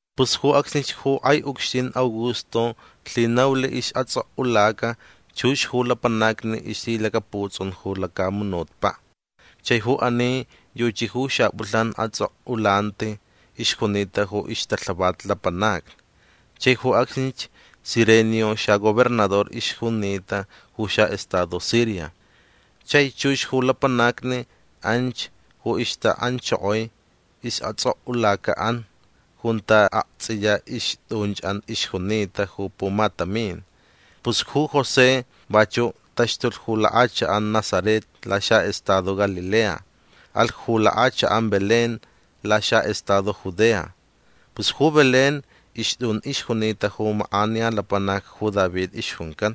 Pus ju acsnich ju kʼai ucxtin Augusto lhinaulh isʼatsʼokʼulaca chux ju lapanacni ixlhilacaputsʼun ju lacamunutpaʼ. Chai ju ani yuchi ju xapʼulhnan atsʼokʼulanti ixjunita ju ixtalhavat lapanacni. Chai ju acsnich Cirenio xagobernador ixjunita ju xaʼestado Siria. Chai chux ju lapanacni anch ju ixtaʼanchokoi istsʼokʼulacaʼan junta aktsʼiya ixtʼunchʼan ixjunita ju pumatamin. Pus ju José vachuʼ taxtulh ju lakʼachakʼan Nazaret laxaʼestado Galilea. Alh ju lakʼachakʼan Belén laxaʼestado Judea. Pus ju Belén ixtʼun ixjunita ju makʼaniya lapanac ju David ixjuncan.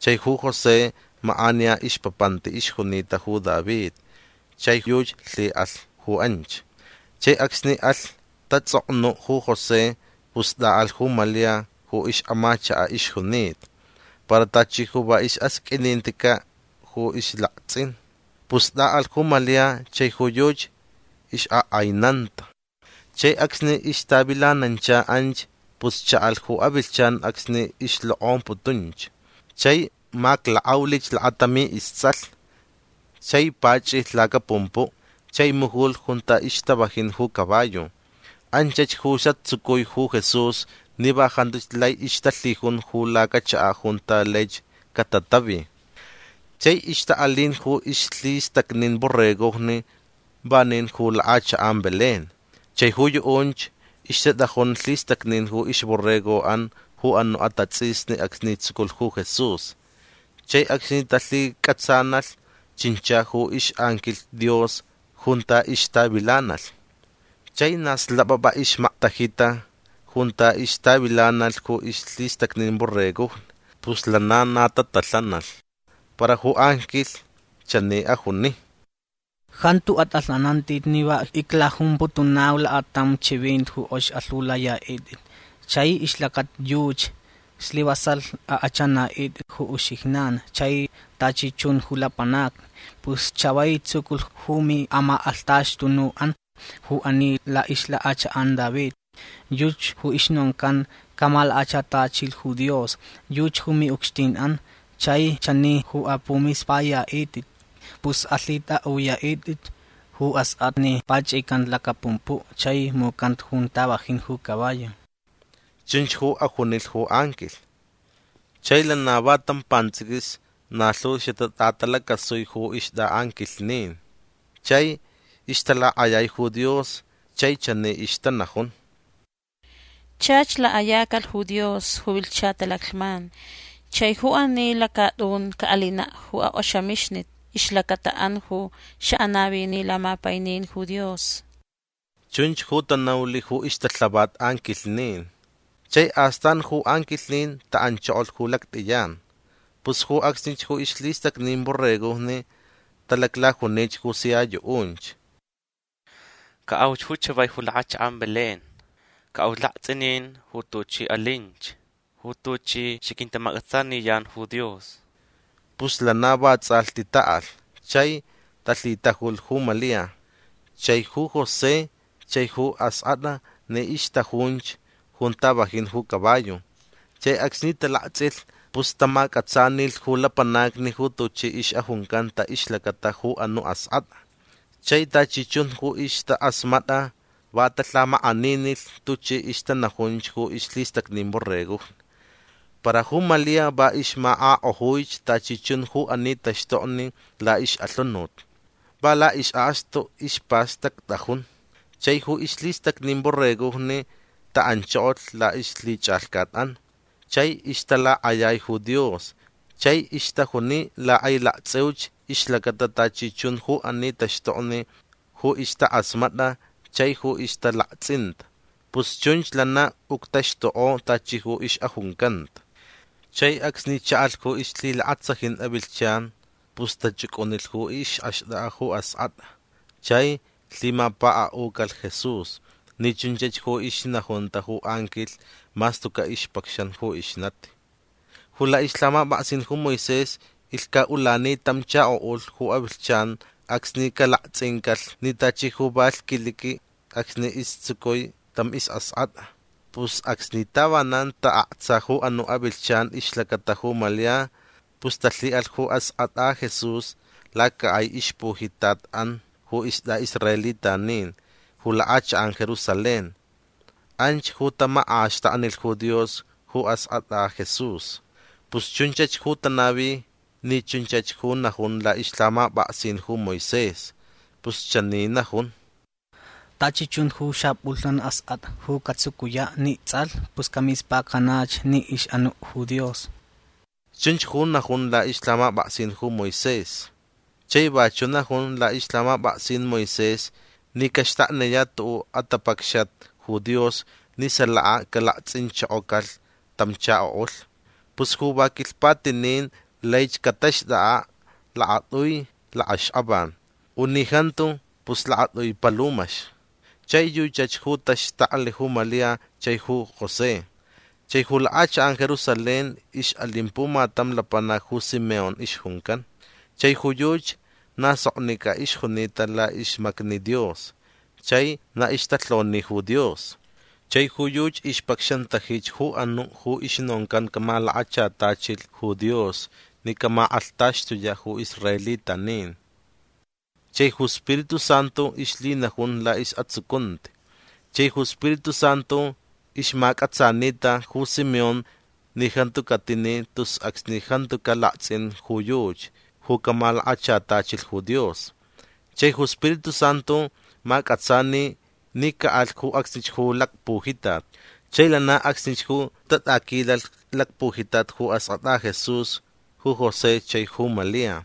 Chai ju José makʼaniya ixpapanti ixjunita ju David chai yuchi lhiʼalh ju anch. Chai acsni alh tatsʼoknuʼ ju José pus tʼaʼalh ju Malia ju ixʼamachakaʼ ixjunita. Para tachi ju va isʼasqʼuininticaʼ ju ixlaktsʼin. Pus tʼaʼalh ju Malia chai ju yuchi ixʼakʼainanta. Chai acsni ixtavilanancha anch pus chaʼalh ju avilhchan acsni ixlokʼomputunch. Chai maklakʼaulich lakatami istsʼalh. Chai pachʼilh lacapumpuʼ chai mujulh junta ixtavajin ju caballo. Anchach ju satsucui ju Jesús ni va jantuch lai ixtalhijun ju lacachakaʼ junta laich catatavi. Chai ixtaʼalin ju ixlhistacnin borregojni vanin ju lakʼachakʼan Belén. Chai ju yuʼunch ixtatʼajun lhistacnin ju ixborregoʼan ju anuʼ atatsʼisni acsni tsuculh ju Jesús. Chai acsni talhicʼatsanalh chincha ju ixʼanquilh Dios junta ixtavilanalh. Chai na xlapʼapʼa ixmaktajita junta ixtavilanalh ju ixlhistacnin borregojni. Pus lana na tatalhanalh. Para ju anquilh chani ajuni: ―Jantu atʼalhanantʼit ni va iclajumputunau lakatam chivinti ju kʼox alhiulayaʼitʼit. Chai ixlacata yuchi slivasalh akʼachʼanaʼitʼit ju uxijnan chai tachi chun ju lapanacni. Pus chavai tsuculh ju miʼamakʼalhtaxtunuʼan ju ani laʼixlakʼachakʼan David. Yuchi ju ixnoncan camalakachatachilh ju Dios. Yuchi ju miʼucxtinʼan. Chai chani ju apʼumispʼayaʼitʼit. Pus alhitʼaʼuyaʼitʼit ju askʼatʼa ni pachʼicanta lacapumpuʼ chai mucanta junta vajin ju caballo. ―Chunch ju ajunilh ju anquilh. Chai lana va tam pantsʼiquis na lhu xatatʼatalacasui ju ixtʼaʼanquilhnin. Chai ixtalakʼayai ju Dios chai chani ixtanajun: ―Chach lakʼayacalh ju Dios ju vilhcha talaclhman. Chai ju ani lacatʼun caʼalinaʼ ju akʼoxamixnit ixlacataʼan ju xaʼanavini lamapainin ju Dios ―chunch ju tanaulh ju ixtalhavat anquilhnin. Chai astan ju anquilhnin taʼanchokolh ju lactʼiyan. Pus ju acsnich ju ixlhistacnin borregojni talaclajunich ju sia yuʼunch: ―Caʼauch ju chavai ju lakʼachakʼan Belén. Caʼau laktsʼinin ju tuchi alinch. Ju tuchi xaquintamacʼatsaniyan ju Dios. Pus lana vatsʼalhti taʼalh. Chai talhitajulh ju Malia chai ju José chai ju askʼatʼa ni ixtʼajunch junta vajin ju caballo. Chai acsni talaktsʼilh pus tamacʼatsanilh ju lapanacni ju tuchi ixʼajuncanta ixlacata ju anuʼ askʼatʼa. Chai tachi chun ju ixtakʼasmatʼa va talhamakʼaninilh tuchi ixtanajunch ju ixlhistacnin borregojni. Para ju Malia va ixmakʼakʼojuich tachi chun ju ani taxtokni laʼixʼalhunut. Va laʼisʼakstu ispastactʼajun. Chai ju ixlhistacnin borregojni taʼanchokolh laʼixlhichʼalhcatʼan. Chai ixtalakʼayai ju Dios chai ixtajuni lakʼailaktsʼiuch ixlacata tachi chun ju ani taxtokni ju ixtakʼasmatʼa chai ju ixtalaktsʼinta. Pus chunch lana uctaxtukʼo tachi ju ixʼajuncanta. Chai acsni chaʼalh ju ixlhilakatsajin avilhchan pus tachʼucʼunilh ju ixʼaxtʼakʼa ju askʼatʼa chai lhimapakaʼucalh Jesús ni chunchach ju ixnajunta ju anquilh mas tucaʼ ixpacxan ju ixnati. Ju laʼixlhamapʼaksin ju Moisés ilhcaʼulani tam chakoʼulh ju avilhchan acsni calaktsʼincalh ni tachi ju va lhquiliqui acsni istsucui tam isʼaskʼatʼa. Pus acsni tavanan taʼaktsa ju anuʼ avilhchan ixlacata ju Malia pus talhiʼalh ju askʼatʼa Jesús lacakʼai ixpujitatʼan ju istʼaʼisraelitanin ju lakʼachakʼan Jerusalén. Anch ju tamakʼaxtaknilh ju Dios ju askʼatʼa Jesús. Pus chunchach ju tanavi ni chunchach ju najun laʼixlhamapʼaksin ju Moisés. Pus chani najun: “Tachi chun ju xapʼulhnan askʼatʼa ju catsucuyaʼ ni tsʼalh pus camispacanach ni ixʼanuʼ ju Dios”. Chunch ju najun laʼixlhamapʼaksin Moisés. Chai vachuʼ najun laʼixlhamapʼaksin Moisés ni caxtakniyaʼ tuʼuʼ atapacxat ju Dios ni salaka calaktsʼinchokocalh tam chakoʼulh. Pus ju va quilhpatinin laich cataxtʼakʼaʼ lakatʼui lakʼaxkʼavan. U ni jantu pus lakatʼui palumax. Chai yuchach ju taxtaklh ju Malia chai ju José. Chai ju lakʼachakʼan Jerusalén ixʼalin pumatam lapanac ju Simeón ixjuncan. Chai ju yuchi na soknicʼa ixjunita laʼixmacni Dios chai na ixtalhoni ju Dios. Chai ju yuchi ixpacxantajich ju anuʼ ju ixnoncan camalakachatachilh ju Dios ni caʼamakʼalhtaxtuyaʼ ju israelitanin. Chai ju Spiritu Santu ixlhinajun laʼisʼatsucunti. Chai ju Spiritu Santu ixmacʼatsanita ju Simeón ni jantu catini tus acsni jantucaʼ laktsʼin ju yuchi ju camalakachatachilh ju Dios. Chai ju Spiritu Santu macʼatsani ni caʼalh ju acsnich ju lacpujitat. Chai lana acsnich ju tatʼaquilalh lacpujitat ju askʼatʼa Jesús ju José chai ju Malia.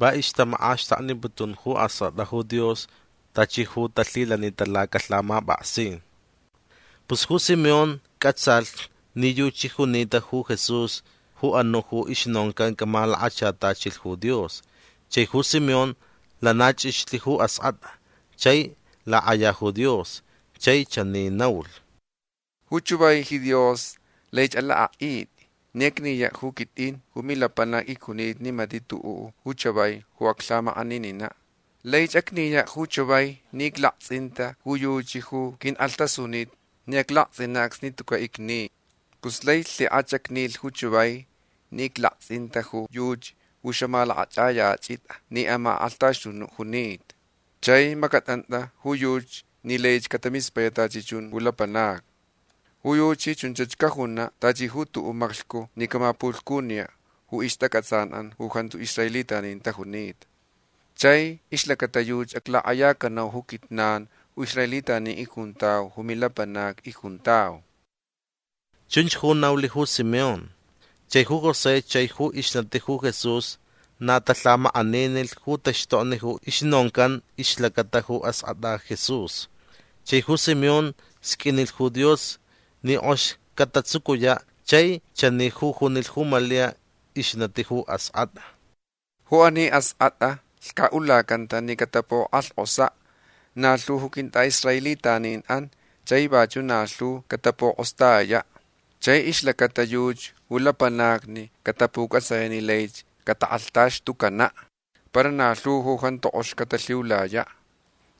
Va ixtamakʼaxtakniputun ju askʼatʼa ju Dios tachi ju talhilanita lacalhamapʼaksin. Pus ju Simeón cʼatsalh ni yuchi junita ju Jesús ju anuʼ ju ixnoncan camalakachatachilh ju Dios. Chai ju Simeón lana chʼixlh ju askʼatʼa. Chai lakʼaya ju Dios. Chai chani naulh: ―Ju chavai ji Dios laich alakʼaʼitʼi ni acniyaʼ ju quitʼin ju milapanac icjunita ni matiʼ tuʼuʼ ju chavai ju aclhamakʼanininaʼ. Laich acniyaʼ ju chavai ni iclaktsʼinta ju yuchi ju qʼuinkʼalhtʼasunitʼa ni aclaktsʼinaʼ acsni tucaʼ icni. Pus lai lhikʼach acnilh ju chavai ni iclaktsʼinta ju yuchi ju xamalakʼachʼayachʼitʼa ni amakʼalhtaxtunuʼ junita. Chai macʼatʼantʼa ju yuchi ni laich catamispayaʼ tachi chun ju lapanacni. Ju yuchi chunch cajunaʼ tachi ju tuʼuʼ maclhcu ni camapulhcuniyaʼ ju ixtacʼatsanʼan ju jantu israelitanin tajunita. Chai ixlacata yuchi aclakʼayacanau ju quijnan ju israelitanin icjuntau ju milapanacni icjuntau ―chunch ju naulh ju Simeón. Chai ju José chai ju ixnati ju Jesús na talhamakʼaninilh ju taxtokni ju ixnoncan ixlacata ju askʼatʼa Jesús. Chai ju Simeón sqʼuinilh ju Dios ni kʼox catatsucuyaʼ chai chani ju junilh ju Malia ixnati ju askʼatʼa: ―Ju ani askʼatʼa lhcaʼulacanta ni catapukʼalhkʼosaʼ na lhu ju quintʼaʼisraelitaninʼan chai vachuʼ na lhu catapukʼostayayaʼ. Chai ixlacata yuchi ju lapanacni catapucʼatsayaʼ ni laich catakʼalhtaxtucanaʼ. Para na lhu ju jantu kʼox catalhiulayaʼ.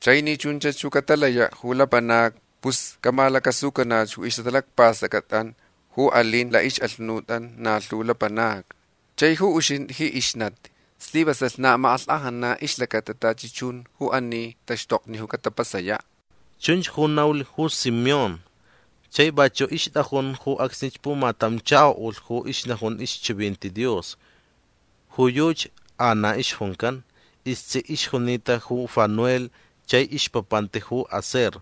Chai ni chunch ju catalayaʼ ju lapanacni pus camalacasucanach ju ixʼatalacpastʼacʼatʼan ju alin laʼixʼalhunutʼan na lhu lapanacni. Chai ju uxintʼi ji ixnati slivasalh na amakʼalhkʼajnanaʼ ixlacata tachi chun ju ani taxtokni ju catapasayaʼ. ―Chunch ju naulh ju Simeón. Chai vachuʼ ixtʼajun ju acsnich pumatam chakoʼulh ju ixnajun ixchivinti Dios. Ju yuchi Ana ixjuncan. Istsiʼ ixjunita ju Fanuel chai ixpapanti ju Aser.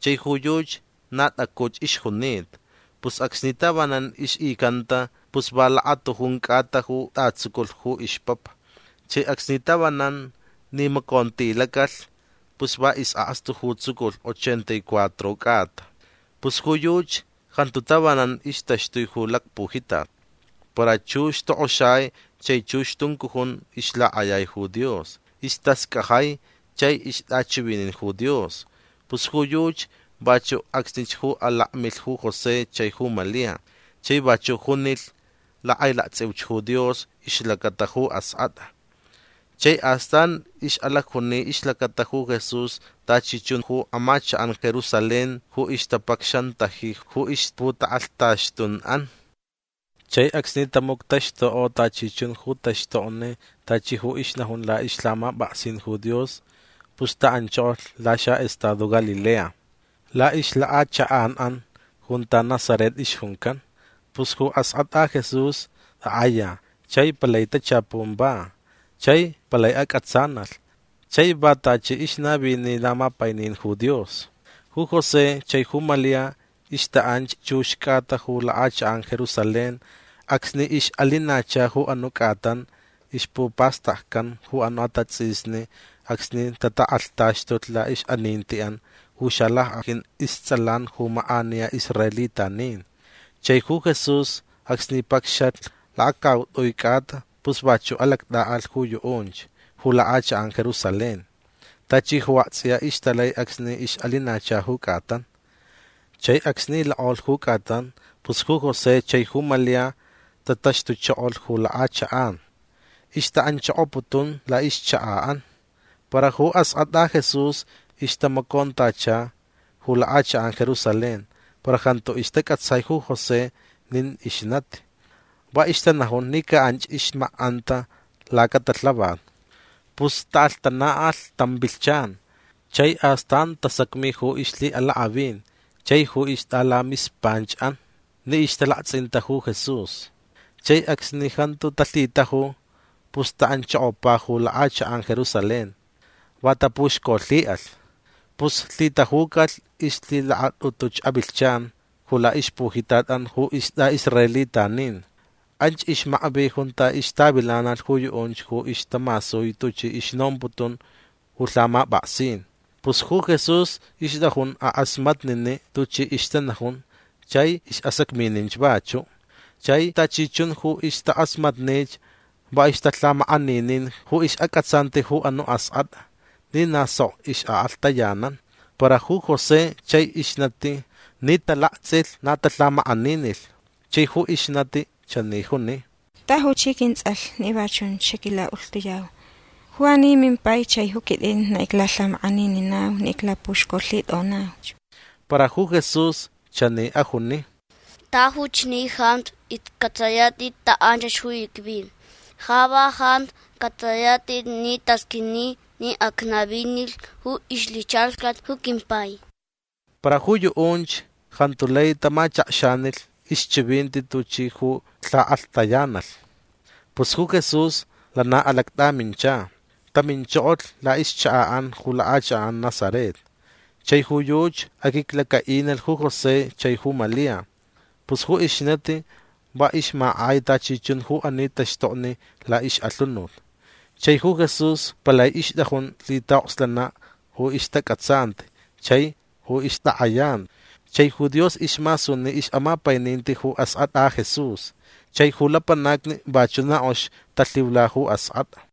Chai ju yuchi na tʼacuch ixjunita. Pus acsni tavanan ixʼicanta pus va lakatujun cʼata ju tʼatsuculh ju ixpapa. Chai acsni tavanan nimacontilacalh pus va isʼakstu ju tsuculh ochenta y cuatro cʼata. Pus ju yuchi jantu tavanan ixtaxtui ju lacpujitat. Para chux tokʼoxai chai chux tuncujun ixlakʼayai ju Dios. Istascajai chai ixtʼachivinin ju Dios. Pus ju yuchi vachuʼ acsnich ju alakmilh ju José chai ju Malia. Chai vachuʼ junilh lakʼailaktsʼiuch ju Dios ixlacata ju askʼatʼa. Chai astan ixʼalacjuni ixlacata ju Jesús tachi chun ju amachakʼan Jerusalén ju ixtapacxantaji ju ixputakʼalhtaxtunʼan. Chai acsni tamuctaxtukʼo tachi chun ju taxtokni tachi ju ixnajun laʼixlhamapʼaksin ju Dios pus taʼanchokolh laxaʼestado Galilea. Laʼixlakʼachakʼanʼan junta Nazaret ixjuncan. Pus ju askʼatʼa Jesús takʼaya chai palai tachapun va. Chai palai acʼatsanalh. Chai va tachi ixnavini lamapainin ju Dios. Ju José chai ju Malia ixtaʼanch chux cʼata ju lakʼachakʼan Jerusalén acsni ixʼalinacha ju anuʼ cʼatan ixpupastaccan ju anuʼ atatsʼisni acsni tatakʼalhtaxtulh laʼixʼanintiʼan ju xalackʼajin istsʼalan ju makʼaniya israelitanin. Chai ju Jesús acsni pacxalh lakacautʼui cʼata pus vachuʼ alactʼaʼalh ju yuʼunch ju lakʼachakʼan Jerusalén tachi ju aktsʼiya ixtalai acsni ixʼalinacha ju cʼatan. Chai acsni lakʼolh ju cʼatan pus ju José chai ju Malia tataxtuchokolh ju lakʼachakʼan. Ixtaʼanchokoputun laʼixchakaʼan. Para ju askʼatʼa Jesús ixtamacontacha ju lakʼachakʼan Jerusalén para jantu istacʼatsai ju José nin ixnati. Va ixtanajun ni ca anch ixmakʼanta lacatalhavat. Pus taʼalhtanalh tam vilhchan. Chai astan tasacmi ju ixlhiʼalakʼavin chai ju ixtʼalamispanchʼan ni ixtalaktsʼinta ju Jesús. Chai acsni jantu talhitaju pus taʼanchokopa ju lakʼachakʼan Jerusalén. Va tapuxcolhiʼalh. Pus lhitajucalh ixlhilakatʼutuch avilhchan ju laʼixpujitatʼan ju istʼaʼisraelitanin. Anch ixmakvi junta ixtavilanalh ju yuʼunch ju ixtamasui tuchi ixnomputun ju lhamapʼaksin. Pus ju Jesús ixtʼajun akʼasmatniniʼ tuchi ixtanajun chai isʼasacmininch vachuʼ. Chai tachi chun ju ixtakʼasmatnich va ixtalhamakʼaninin ju ixʼacʼatsanti ju anuʼ askʼatʼa ni na sok ixʼakʼalhtayanan. Para ju José chai ixnati ni talaktsʼilh na talhamakʼaninilh. Chai ju ixnati chani juni: ―Tajuch ji quintsʼalh ni va chunch xaquilaʼulhtuyau. Ju ani mimpai chai ju quitʼin na iclalhamakʼanininau ni iclapuxcolhitʼonauch. Para ju Jesús chani ajuni: ―Tajuch ni jantu iscʼatsʼayatʼit taʼanchach ju icvi. Ja va jantu cʼatsʼayatʼit ni tasqʼuini ni acnavinilh ju ixlhichʼalhcat ju quimpai. Para ju yuʼunch jantu lai tamachakxanilh ixchivinti tuchi ju lhakʼalhtayanalh. Pus ju Jesús lana alactʼamincha. Taminchokolh laʼixchakaʼan ju lakʼachakʼan Nazaret. Chai ju yuchi aquiclacaʼinilh ju José chai ju Malia. Pus ju ixnati va ixmakʼai tachi chun ju ani taxtokni laʼixʼalhunut. Chai ju Jesús palai ixtʼajun lhitaʼokslanaʼ ju ixtacʼatsanti chai ju ixtakʼayanti. Chai ju Dios ismasuni ixʼamapaininti ju askʼatʼa Jesús. Chai ju lapanacni vachuʼ na kʼox talhiula ju askʼatʼa.